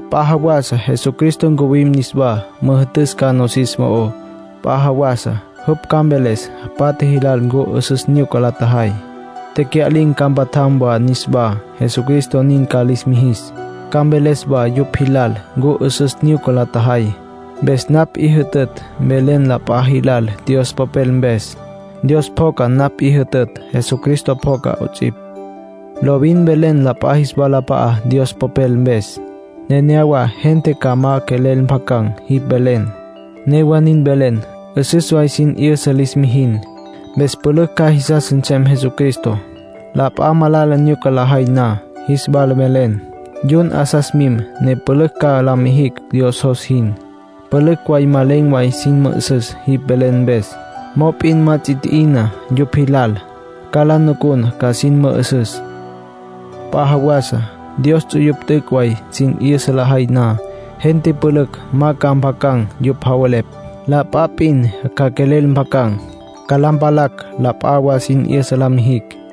P'a jawasa Jesucristo ncuwim niswá, müjü'tüs ca nosis mo'ó. P'a jawasa jupj ca mveles patja jilal ncu 'üsüs nyuca la tjajay. Tecya'lin̈ ca mpatjam wa niswá, Jesucristo nin ca lis mijis. Ca mveles wa yupj jilal ncu 'üsüs nyuca la tjajay. Mpes napj 'i jütütj mvelen la p'a jilal Dios Popel mpes. Dios pjoca napj 'i jütütj. Jesucristo pjoca 'ots'ipj. Lovin mvelen la p'a jis walap'a'á Dios Popel mpes. Nenéyawa gente ca ma quelel mpjacan̈ jipj velen. Newa nin mvelen. 'Üsüs way sin 'yüsa lis mijin. Mpes pülücj ca jisas nsem Jesucristo. La p'a malala nyuca lajay na, jis wala mvelen. Yun 'asas mim, ne pülücj ca la mijicj Dios jos jin. Pülücj way ma len̈ way sin mü'üsüs jipj velen mpes. Mop'in ma ts'i tji'ina yupj jilal. Ca la nucun ca sin mü'üsüs. P'a jawasa Dios ts'uyupj t'üc' way sin 'yüsa lajay na, gente pülücj ma ca mpjacan̈ yupj javelepj. La p'a p'in ca quelel mpjacan̈. Ca la mpalacj la p'a wa sin 'yüsa la mijicj.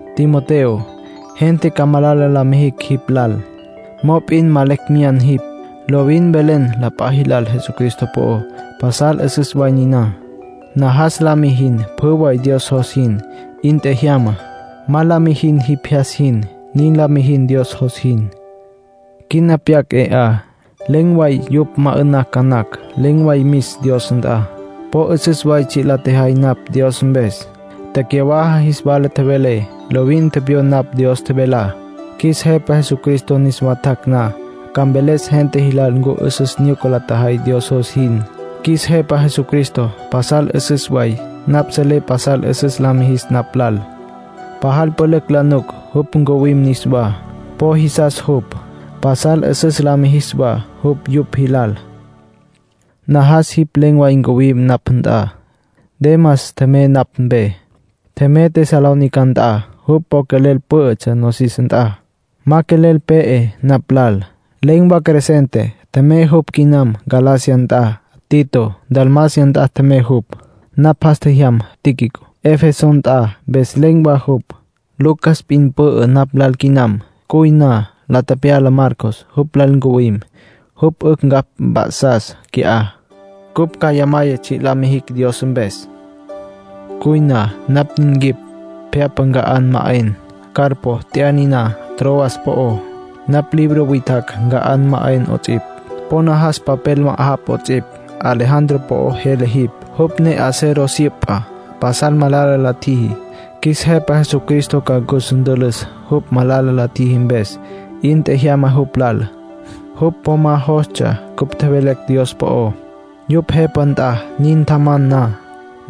Timoteo, gente ca malala la mijicj jipj lal. Mop'in ma lecj meyá jipj. Lovin mvelen la p'a jilal Jesucristo po'ó. Pasal 'üsüs way niná. Najas la mijin pjü way Dios jos jin. 'In tjejyama. Ma la mijin jipj jyas jin. Nin la mijin Dios jos jin. Quina pyac, 'e 'a, len̈ way yupj ma 'ü'nacj ca napj. Len̈ way mis Dios nt'a. Po 'üsüs way tsji' la tjejay napj Dios mpes. Tecyawaja jis wala tjevelé. Lovin tepyon napj Dios tjevelá. Qjuis Jepa Jesucristo niswa tjac' na, ca mveles gente jilal ncu 'üsüs nyuca la tjajay Dios jos jin. Qjuis Jepa Jesucristo pasal 'üsüs way. Napj selé pasal 'üsüs la mijis napj lal. Pajal pülücj la nuc jupj ncuwim niswá. Po jisas jupj. Pasal 'üsüs la mijis wa jupj yupj jilal. Najas jipj len̈ way ncuwim napj nt'a. Demas tjemey napj mpe. Tjemey Tesalónica nt'a. Jupj po quelel pǘ'ütsja nosis nt'a. Ma quelel pe'e napj lal. Len̈ wa Crescente; tjemey jupj quinam Galacia nt'a. Tito Dalmacia nt'a tjemey jupj. Napj jas tjejyam Tíquico Efeso nt'a, mpes len̈ wa jupj. Lucas p'in pü'ü napj lal quinam. Cuy na, la tepyala Marcos, jupj lal ncuwim. Jupj 'ücj ncapj mp'a'sas qui'á; cupj cjaya maya tsji' la mijicj Dios mpes. Cuy na, napj nin quip pje'apa nca'an ma 'en. Carpo tya'a niná Troas po'ó. Napj libro witjacj nca'an ma 'en 'ots'ipj. Po najas papel ma'ajapj 'ots'ipj. Alejandro po'o jele jipj, jupj ne acero syüpa. Pasal malala la ntjiji. Qjuis Jepa Jesucristo ca cus ntülüs, jupj malala la tjiji mpes. 'In tjejyama jupj lal. Jupj po ma jostsja cupj tjevelecj Dios po'ó. Yupj jepa nt'a nin tjaman na,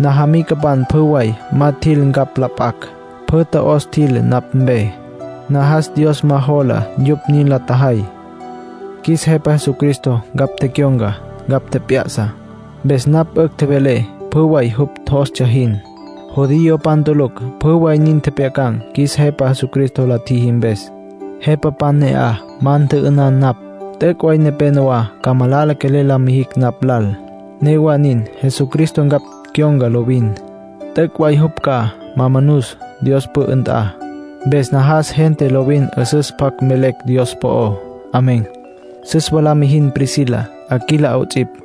najamicapan pjü way ma tjil ncapj la p'acj. Pjü tjo'os tjil napj mpe. Najas Dios ma jola yupj nin la tjajay. Qjuis Jepa Jesucristo ncapj tecyon̈ca, ncapj tjep'ya'sa. Mpes napj 'ücj tjevelé pjü way jupj jostsja jin. Judiopan tulucj pjü way nin tjepjyacan̈. Qjuis Jepa Jesucristo la tjiji mpes, jepapan ne'aj ma ntjü'ünan napj. T'üc' way nepénowa ca malala quelel la mijicj napj lal. Newa nin, Jesucristo ncapj cyon̈ca lovin. T'üc' way jupj ca ma manus Dios pü'ü nt'a. Mpes najas gente lovin 'üsüs pjac mvelecj Dios po'ó. Amén. Süs wa la mijin Priscila, Aquila 'ots'ipj.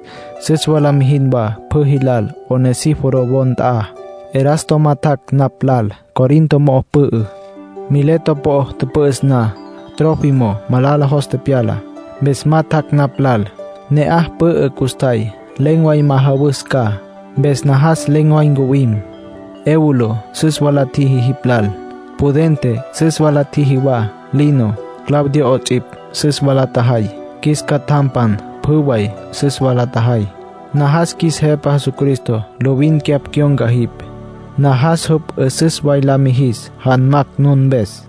Süs wa la mijin wa pjü jilal Onesíforo wo nt'a. Erasto ma tjac' napj lal. Corinto mo'o pü'ü. Mileto po'o tüpü'üs na, Trófimo malala jos tepyala. Mpes ma tjac' napj lal. Ne'aj pü'ü custjay. Len̈ way majawus ca, mpes najas len̈ way ncuwim. Eubulo süs wa la tjiji jipj lal. Pudente süs wa la tjiji wa. Lino, Claudia 'ots'ipj, süs wa la tjajay. Qjuis catjampan pjü way süs wa la tjajay. Najas qjuis Jepa Jesucristo lovin cyapj cyon̈ca jipj. Najas jupj 'üsüs way la mijis janmacj nun mpes.